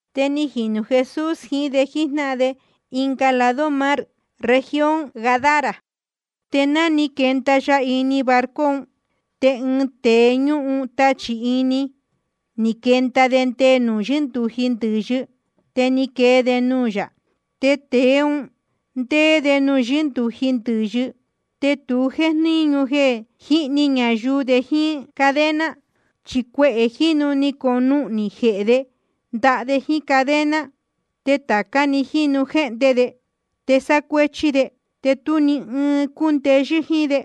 Te ni jinū Jesús jiín de jíjnáhan de ɨnga lado mar, región Gadara. Te ná ni quenda ya ini barco un, te ɨɨn tēe ñúhun tachī ini, ni quenda de nde nuū yɨ́ndūji ndɨ̄yɨ, te ni quee de nuū yā. Tēe un ndéé de nuū yɨ́ndūji ndɨ̄yɨ. Te tu jéjníñu jeē jíhni ñayuu de, ni jíín cadena. Chi cuehē jínu ni conuhnī jehē de ndaha de jíín cadena. Te tāca jínu jéhnde de, te sácuéchí de. Te tú ni ɨɨn cúndeyɨ́ jíín de.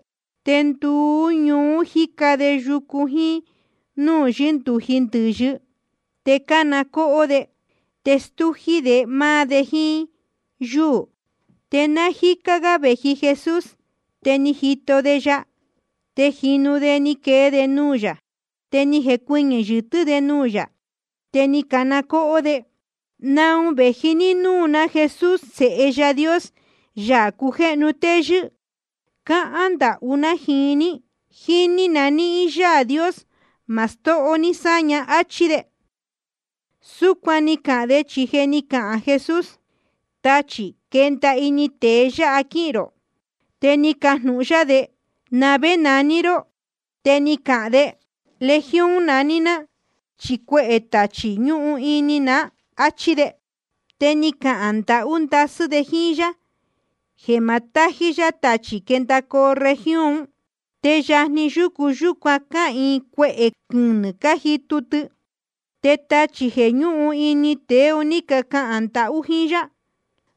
Te nduú ñuú jíca de yucu jíín núū yɨ́ndūji ndɨ̄yɨ, te cána cóhó de, te stújí de máá de jíín yúū. Te náa jícá gá vēji Jesús, te ni jito de ya. Te jínu de ni quee de nuū yā, te ni jecuɨñɨ̄ yɨtɨ́ de nuū yā. Te ni cana cóhó de: ¿Naun vēji ní núū ná, Jesús Sēhe Yaā Dios, Yaā cujéhnu téyɨ́? Cáhán ndahú ná jíín ní, jíni nahín Yaā Dios, ma stóho ní sáña, áchí de. Súcuan ni cahān de, chi je ni cahān Jesús: Táchī, quenda ini tēe yáha quíhīn rō. Te ni cajnūhun yá de: ¿Na vé naní ró? Te ni cahān de: Legión naní ná, chi cuehē tachī ñúhun ini ná, áchí de. Te ni cahān ndahú ndasɨ́ de jíín yá jeē ma tájí yá tachī quendacoo región ún. Te yajni yucu yúcuan cáhīin cuehē quɨnɨ̄ cájitu tɨ. Te tachī jeē ñúhun ini tēe un ní cacahān ndahú jíín yá: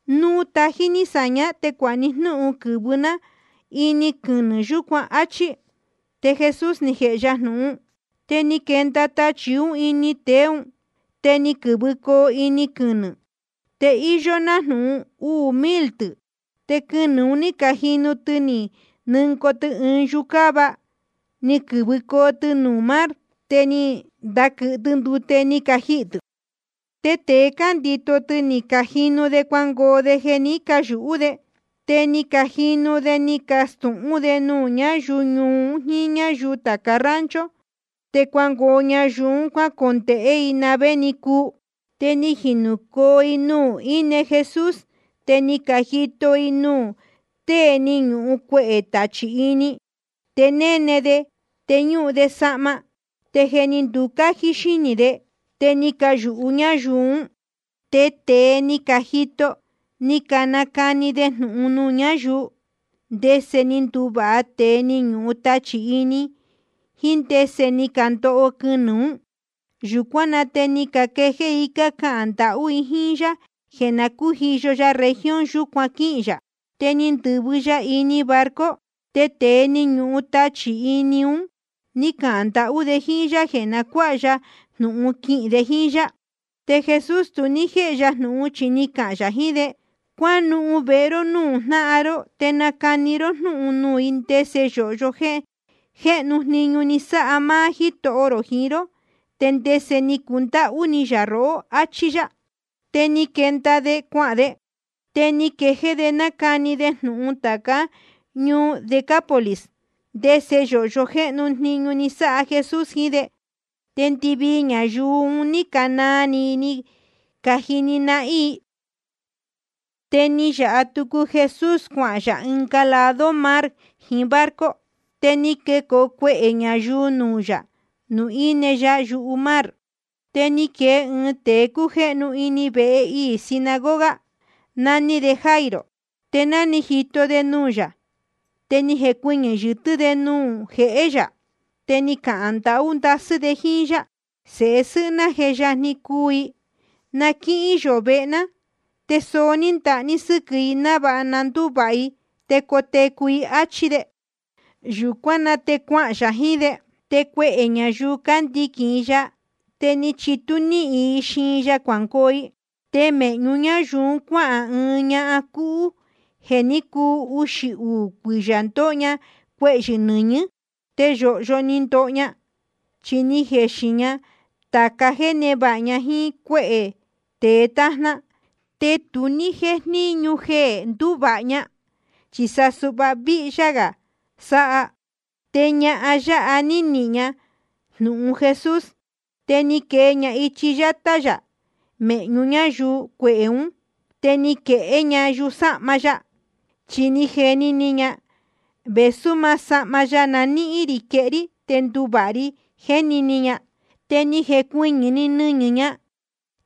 Núu tají ní sāñá, te cuāha ní jnúhun quɨ̄vɨcoo ná ini quɨnɨ̄ yūcuán, áchí. Te Jesús ni jēhe ya jnūhun. Te ni quendacoo tachī ún ini tēe ún, te ni quɨ̄vɨcoo ini quɨnɨ̄, te íyó nájnūhun uū mil tɨ̄. Te quɨnɨ̄ un ní cajinu tɨ ni nɨngoo tɨ ɨɨn yucáva, ni quɨ̄vɨcoo tɨ nuū mar. Te ni ndaquɨ̄hɨ tɨ ndute, ni cajihī tɨ̄. Te tēe cándito tɨ, ni cajinu de cuangoo de jeē ní cayūhú de. Te ni jinūcoo de ni cacastūhún de nuū ñáyuu ñuu un jíín ñáyuu tāca rancho. Te cuangoo ñayuu un cuácondēhé i na vé ni cuu. Te ni jinūcoo i nuū íne Jesús, te ni cajito i nuū tée ni ñuhun cuehē tachī ini. Te néne de, te ñúhun de sahma, te je ni nducájí xínī de. Te ni cayūhú ñáyuu ún. Te tēe ní cajito, ni canacani de jnūhun nuū ñáyuu, ndese ni nduvāha tēe ni ñuhun tachī ini, jiín ndese ni candoho quɨnɨ̄ ún. Yūcuán na te ni caquejéé i cácahān ndahú i jíín yá jeē na cújiyo ya región yūcuan quíhīn yā. Te ni ndɨ̄vɨ ya ini barco. Te tēe ni ñuhun tachī ini un ní cahān ndahú de jíín yá jeē na cuáha ya jnūhun quihīn de jíín yá. Te Jesús tu ní jéhe ya jnūhun, chi ni cahān yā jiín de: Cuánuhun vehe ró núū jnáhan ró, te nacani ró jnúhun nuū i ndese yōhyo jéhnu jniñu ni sáha máá Jítoho rō jiín ró, te ndese ni cundáhú ni yā rohó, áchí yá. Te ni quenda de cuahān de, te ni quejéé de nácani de jnūhun tācá ñuu Decápolis ndese yōhyo jéhnu jniñu ni sáha Jesús jiín de. Te ndɨvii ñayuu un ní canaa ni i cájini nahín i. Te ni nayāha tucu Jesús cuanuhun yā ɨnga lado mar jiín barco. Te ni quecoo cuehē ñayuu nuū yā, nuū íne ya yumar. Te ni quee ɨɨn tēe cújéhnu ini vehe iī sinagoga, naní de Jairo. Te ná ni jito de nuū yā, te ni jecuɨñɨ̄ yɨtɨ́ de nuū jehé yā. Te ni cahān ndahú ndasɨ́ de jíín yá: Sēhe sɨ́hɨ́ ná je yajni cuu i. Na quíhín yō vehe ná te soó ní ndaha ní sɨ́quɨ̄ i návāha na ndúvāha i te cotecu i, áchí de. Yūcuán na te cuahān yā jiín de. Te cuehē ñayuu cándiquīn i ya, te ni chitú níhin i xiin ya cuangoo i. Te mēhñu ñáyuu un cuáhān ɨɨn ñahan cúhú, jeē ní cuu uxī uū cuiyā ndóho ña cuehyɨ̄ nɨñɨ̄. Te yōhyo ni ndoho ña, chi ni jexin ña tāca jéē névāha ña jíín cuéhē tēe tájná, te tu ní jéjníñu jeē ndúvāha ña, chi sa suhva víhyá gā sáha. Te ñahan yáha ná ni nihīn ña jnūhun Jesús, te ni quee ña ichi yátá yā mēhñu ñáyuu cuehē ún, te ni quehé ña yusáhma ya. Chi ni jeni ni ña: Vēsú maá sahma ya na níhín rī quehé rí, te nduvāha ri, jéni ni ña. Te ni jecuɨñɨ̄‑ni nɨñɨ̄ ña,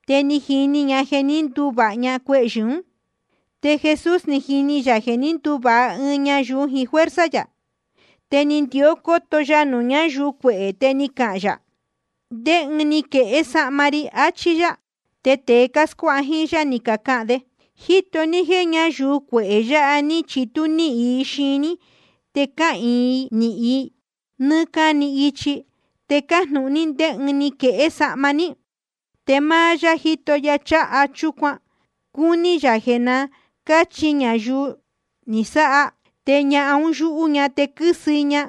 te ni jini ña jeē ní nduvāha ña cuehyɨ̄ ún. Te Jesús ni jini yā jeē ní nduvāha ɨɨn ñayuu jiín fuerza yā. Te ni ndió cóto ya nuū ñáyuu cuehē, te ni cahān yā: ¿Ndé ɨɨn ni quehé sahma ri? Achí yá. Te tēe cáscuáha jíín yá, ni cacahān de: Jíto ní jéē ñáyuu cuehē yāha ní chitú níhin i xiin ní te cáquɨ̄hɨ i níhín nɨ́ɨ́ cáni ichi, te cájnūhun ní ndé ɨɨn ni quehé sahma ní. Te máá yá jíto ya cháha chúcuan, cúní yā jeē na cáchi ñayuu ni sáha. Te ñahan un yúhú ña te quɨ́sɨ i ña,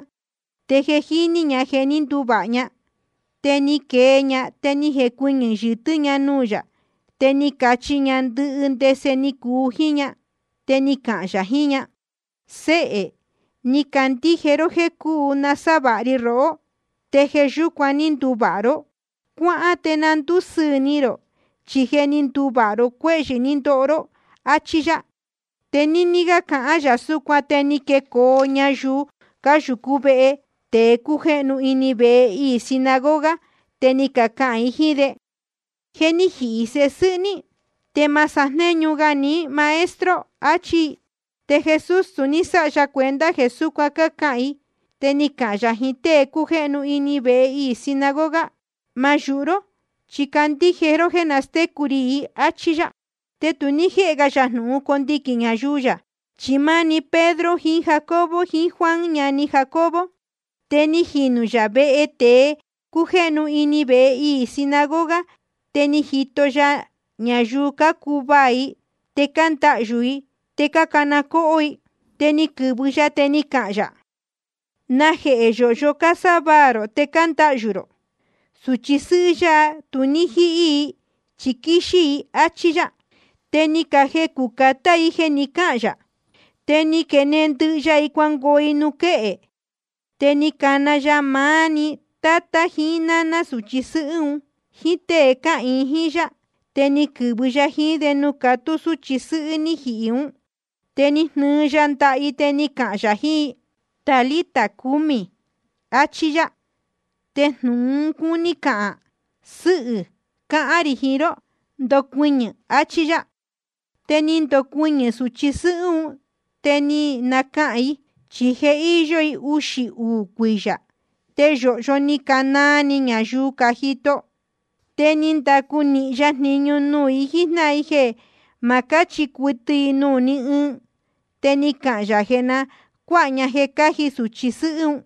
te je jíní ña jeē ní nduvāha ña. Te ni quee ña, te ni jecuɨñɨ̄ yɨtɨ́ ña nuū yā, te ni cachi ña ndɨhɨ ndese ni cuu jíín ña. Te ni cahān yā jiín ña: Séhē, ni candíje ró jéē cuu nasávāha ri rohó, te jeē yúcuan ní nduvāha ró. Cuáhán te na ndúsɨɨ̄ ni rō, chi je ni nduvāha ró cuéhyɨ̄ ní ndoho ró, áchí yá. Te níní cáhán gā yā súcuan, te ni quecoo ñayuu cáyūcú vehe tēe cújéhnu ini vehe iī sinagoga, te ni cacahān i jíín de: Je ni jihī sēhe sɨ́hɨ́ ní. Te ma sajnéñu ga ní Maestro, achí i. Te Jesús tu ní sáha ya cuenta jeē súcuan cácahān i, te ni cahān yā jiín tée cújéhnu ini vehe iī sinagoga: Ma yūhu ró, chi candíje ró jéē nastécu rī i, áchí yá. Te tu ní jéhe ga yā jnūhun condiquīn ñayuu yā, chi máá‑ni Pedro jiín Jacobo, jiín Juan ñani Jacobo. Te ni jinū yā vehe tēe cújéhnu ini vehe iī sinagoga, te ni jito ya ñayuu, cácuvaā i, te cándahyū i, te cácana cóhó i. Te ni quɨ̄vɨ ya, te ni cahān yā: ¿Najehē yōhyo cásávaā rō te cándahyū rō? Sūchi sɨ́hɨ́ yáha, tu ní jíhí i, chi quíxí‑ni i, áchí yá. Te ni cajecū catá i jeē ni cáhān yā. Te ni quenehen ndɨhɨ ya i cuahān i nuū quéhe. Te ni cana ya máá‑ni tátá jiín náná sūchi sɨ́hɨ́ un, jíín tée cáhīin jíín yá, te ni quɨ̄vɨ ya jiín de nuū catú súchi sɨ́hɨ́ ní jihī ún. Te ni jnɨɨ ya ndaha i, te ni cahān yā jiín i: Talita cumi, achí yá. Te jnūhun un cúní cahān: Sɨ́hɨ̄, cáhán rī jiín ró, ndocuɨñɨ̄, achí yá. Te ni ndocuɨñɨ̄‑ni sūchi sɨ́hɨ́ un, te ni nacaca i, chi je íyó i uxī uū cuiyā. Te yōhyo ni canaa ni ñayuu cájito i. Te ni ndacu nīhin ya jniñu nuū i jíjnáhan i jeē ma cáchi cuɨtɨ i nuū ni ɨɨn. Te ni cahān yā jeē na cuáha ña jeē cáji sūchi sɨ́hɨ́.